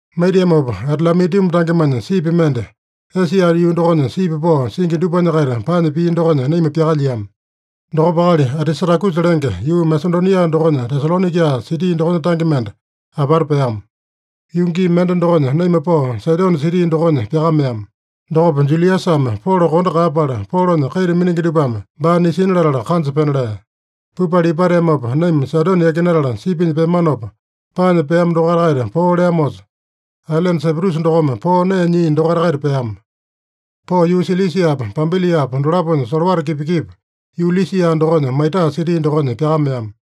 Maitiamopa Adalamituma tangemanya sipi mende, Esia yuu dokonya sipi pao singi dupanya-kaita paanya pia dokonya naima pyakalyiama. Dokopa akali Atisatakusa lenge, yuu Masedonia dokonya Tesalonaika siti dokonya tange mende apata peama. Yuu gii mende dokonya naima pao Saidone siti dokonya pyakameama. Dokopa Juliasame Polo kondo kaeyapala, Polonya kaita miningi dupame baa nisina latala, kanja pena lea. Pupala ipateamopa, naima Saidone yakinatala sipinya peamanopa, paanya peama dokaita-kaita poo leamosa, ailene Saiprusa dokome poo nee nyia dokaita-kaita peama. Pao yuu Silisiapa, Pampiliapa dolaponya solowata kipa-kipa, yuu Lisia dokonya Maitaa siti dokonya pyakameama.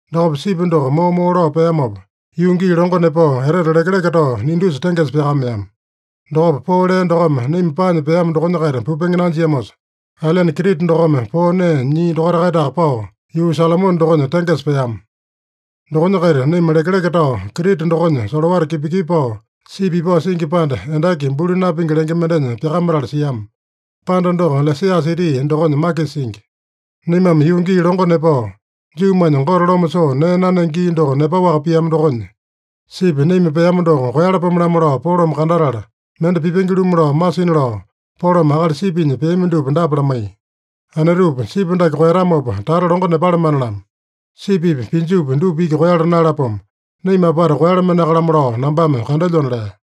Dokopa sipi doko moo-moo lao peamopa, yuu gii longo nepao, etete lekeleke tao Nidusa tengesa pyakameama. Dokopa poo lea dokome naima paanya peama dokonya-kaita pupenge nanjiamosa, ailene Krita dokome poo nee nyia dokaita-kaitaka pao, yuu Salomone dokonya tengesa peama. Dokonya-kaita naima lekeleke tao Krita dokonya solowata kipa-kipa pao, sipi ipao singi panda, Endaki Buli Napingi lenge mendenya pyakamatala siama. Panda doko Lasea siti dokonya makisa singi. Naimame yuu gii longo nepao, Juumanya Gote Loma Soo Nee Nanenge Gii doko nepaowaka piama dokonya, sipi naima peama doko koeyalapome-lamo lao Polome kandatala, mende pipenge-lumu lao masina lao, Polome akali sipinya peami dupa dapa lamaiya: “Anetupa, sipi dake koeyatamopa, tata longo nepalamane-lamo. Sipipi pinjupi dupa iki koeyala naeyalapomo. Naima apata kumalamaneaka-lamo lao nambame kandelyona” lea.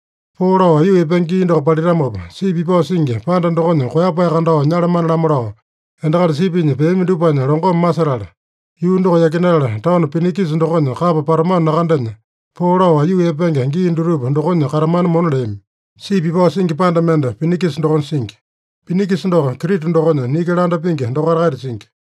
Poo lao aiyuu epenge gii doko palitamopa, sipi ipao singi panda dokonya koeyapae kandao nyalamane-lamo lao endakali sipinya peami dupanya longome masetala, yuu doko yakinatala taono Pinikisa dokonya kapa patamano nakandenya, poo lao aiyuu epenge gii dutupa dokonya katamana mona leami. Sipi ipao singi panda mende Pinikisa dokonya singi. Pinikisa doko Krita dokonya niki landa pingi dokaita-kaita singi.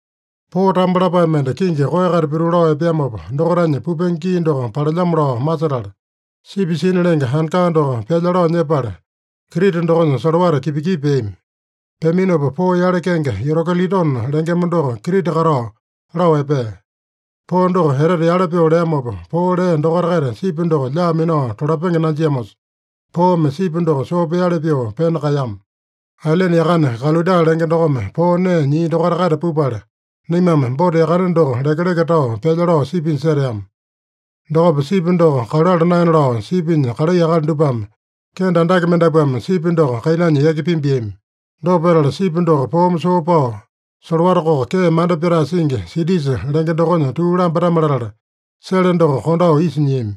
Poo tambo lapae mende kingi koeya-kaita pituu lao epeamopa, dokaitanya pupenge gii doko palelyamo lao masetala, sipi sina lenge anka doko pyalya lao nyepala, Krita dokonya solowata kipa-kipa peami. Peaminopa poo yale, kenge Yurokilidone lengema doko Krita katao lao epea. Poo doko etete yale pyoo leamopa, poo lea dokonya-kaita sipi doko lyaa minao tolapenge nanjiamosa, poome sipi doko soo peali pyoo pena kaeyama. Ailene yakane Kalauda lenge dokome poo nee nyia dokaita-kaita pupala, naimame bouta yakane doko lekeleke tao pyalya lao sipinya seteama. Dokopa sipi doko kaluala naena lao sipinya kalai akali dupame kende andake mendapuame sipi doko kainanya yaki pimbiami. Dopa petala, sipi doko poome soo pao, solowata koko kee manda pyatae singi, Sitisa lenge dokonya tuu lambatame-latala, sele doko kondao isa nyiami.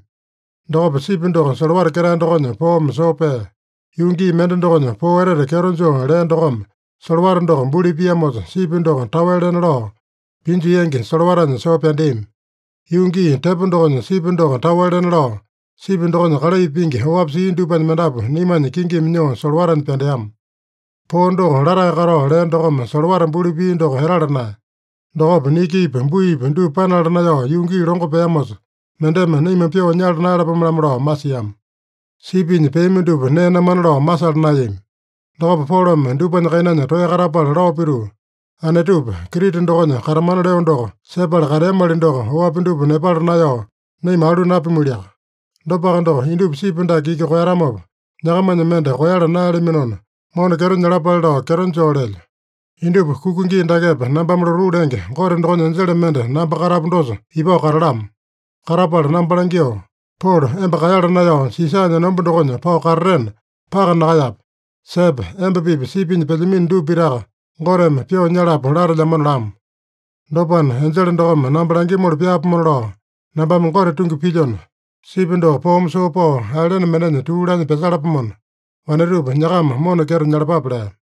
Dokopa sipi doko solowata ketae dokonya poome soo pea. Yuu gii mende dokonya, poo etete kyeto joo lea dokome solowata doko buli piamosa, sipi doko taowe lena lao, pinju yangi solowatanya soo pyandeami. Yuu gii tepo dokonya, sipi doko taowe lena lao, sipi dokonya kalai pingi oapi sia dupanya mendapu naimanya kingimi nyoo solowatanya pyandeama. Poo doko latae katao lea dokome solowata buli pia doko etala naeya. Dokopa nikipi buipi dupa panala naeyao yuu gii longo peamosa, mendeme naima pyoo nyala naeyalapome-lamo lao masiama. Sipinya peami dupa nee namana lao masala naeyami. Dokopa Polome dupanya kainanya toeya katapala lao pituu, “Anetupa, Krita dokonya katamana leo doko sepala kateamali doko, oapi dupa nepala naeyao naima alu napimualiaka. Dopaka doko, indupa sipi dake iki koeyatamopa, nyakamanya mende koeyala naeyalaminona, mona kyeto nyalapale lao kyeto joo lelyo. Indupa kuka gii dakepa nambame lotuu lenge Gote dokonya enjele mende namba katapu dosa ipao katalamo. Katapala namba langyoo, ‘Polo, emba kaeyala naeyao Sisanya enomba dokonya pao katatena, paka nakaeyape. Sepe, emba-pipa sipinya pelyamino dupa pitaka Goteme pyoo nyalapo latelyamona’ lamo. Dopana, enjele dokome namba langyomoli pyaapomona lao nambame Gote tungi pilyona, sipi doko poome soo pao ailene mendenya tuu laanya pyasalapomona, wanetupa, nyakama mona kyeto nyalapape” lea.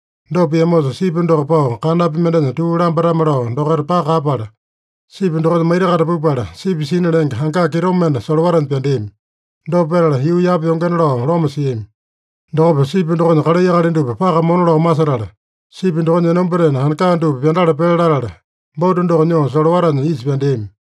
Dopa piamosa, sipi doko pao kanapi mendenya tuu lambatame-lao dokaita paka kaeyapala, sipi dokonya maita-kaita pupala, sipi sina lenge anka kitomende solowatanya pyandeami. Dopa petala, yuu yapa yongena lao loma siami. Dokopa sipi dokonya kalai akali dupa paka mona lao masetala, sipi dokonya enombatena anka dupa pyandala pele latala, bouta doko nyoo solowatanya isa pyandeami.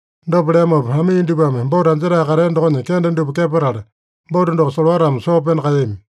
Dopa leamopa, amii dupame bouta anjetae katea dokonya kende dupa kepatala, bouta doko solowatame soo pena kaeyami.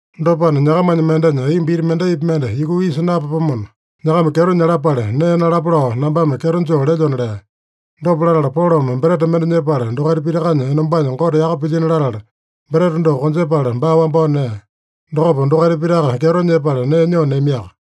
Dopana, nyakamanya mendenya aiyomba iti mendaipi mende yukuu isa napapomona, nyakama kyeto nyalapale nee nalapa lao nambame kyeto joo lelyona” lea. Dopa latala Polome breta mende nyepala, dokaita pitakanya enombanya Gote yaka pilyino latala, breta doko konjepala, baa wambao nea. Dokopa dokaita pitaka kyeto nyepala nee nyoo neamiaka.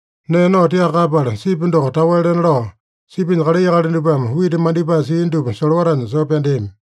Nee nao tiaka kaeyapala, sipi doko taowe lena lao, sipinya kalai akali dupame wita mandipae sia dupa solowatanya soo pyandeami.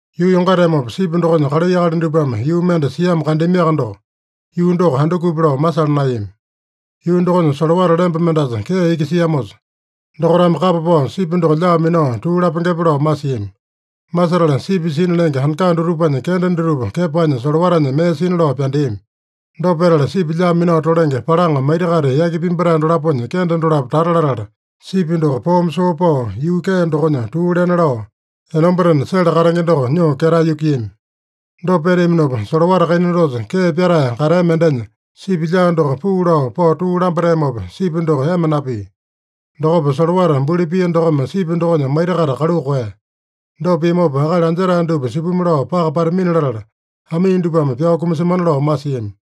Yuu yongateamopa, sipi dokonya kalai akali dupame yuu mende siamo kandeamiaka doko, yuu doko andukupi lao masala naeyami. Yuu dokonya solowata lemba mendasa kee iki siamosa, dokaitame kapa pao sipi doko lyaa minao tuu lapengepe lao masiami. Masetala sipi sina lenge anka dutupanya kende dutupa kepanya solowatanya mee sina lao pyandeami. Dopa petala, sipi lyaa minao tolenge palaŋa maita-kaita yaki pimbatae dolaponya kende dolapo tata latala, sipi doko poome soo pao, yuu kee dokonya tuu lena lao, enombatena sele katenge doko nyoo ketae yukuiyami. Dopa peteaminopa, solowata kaina dosa kee pyatae katea mendenya sipi lyaa doko puu lao pao tuu lambateamopa, sipi doko ema napia. Dokopa solowata buli pia dokome sipi dokonya maita-kaita kaluu koeya. Dopa piamopa, akali anjetae dupa supimi lao paka patamina latala, amii dupame pyao kumasemana lao masiami.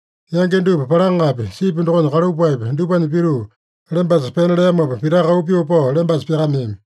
Yangi dupa palaŋapi, sipi dokonya kalupaepi, dupanya pituu lembasa pena leamopa, pitaka auu pyoo pao lembasa pyakameami.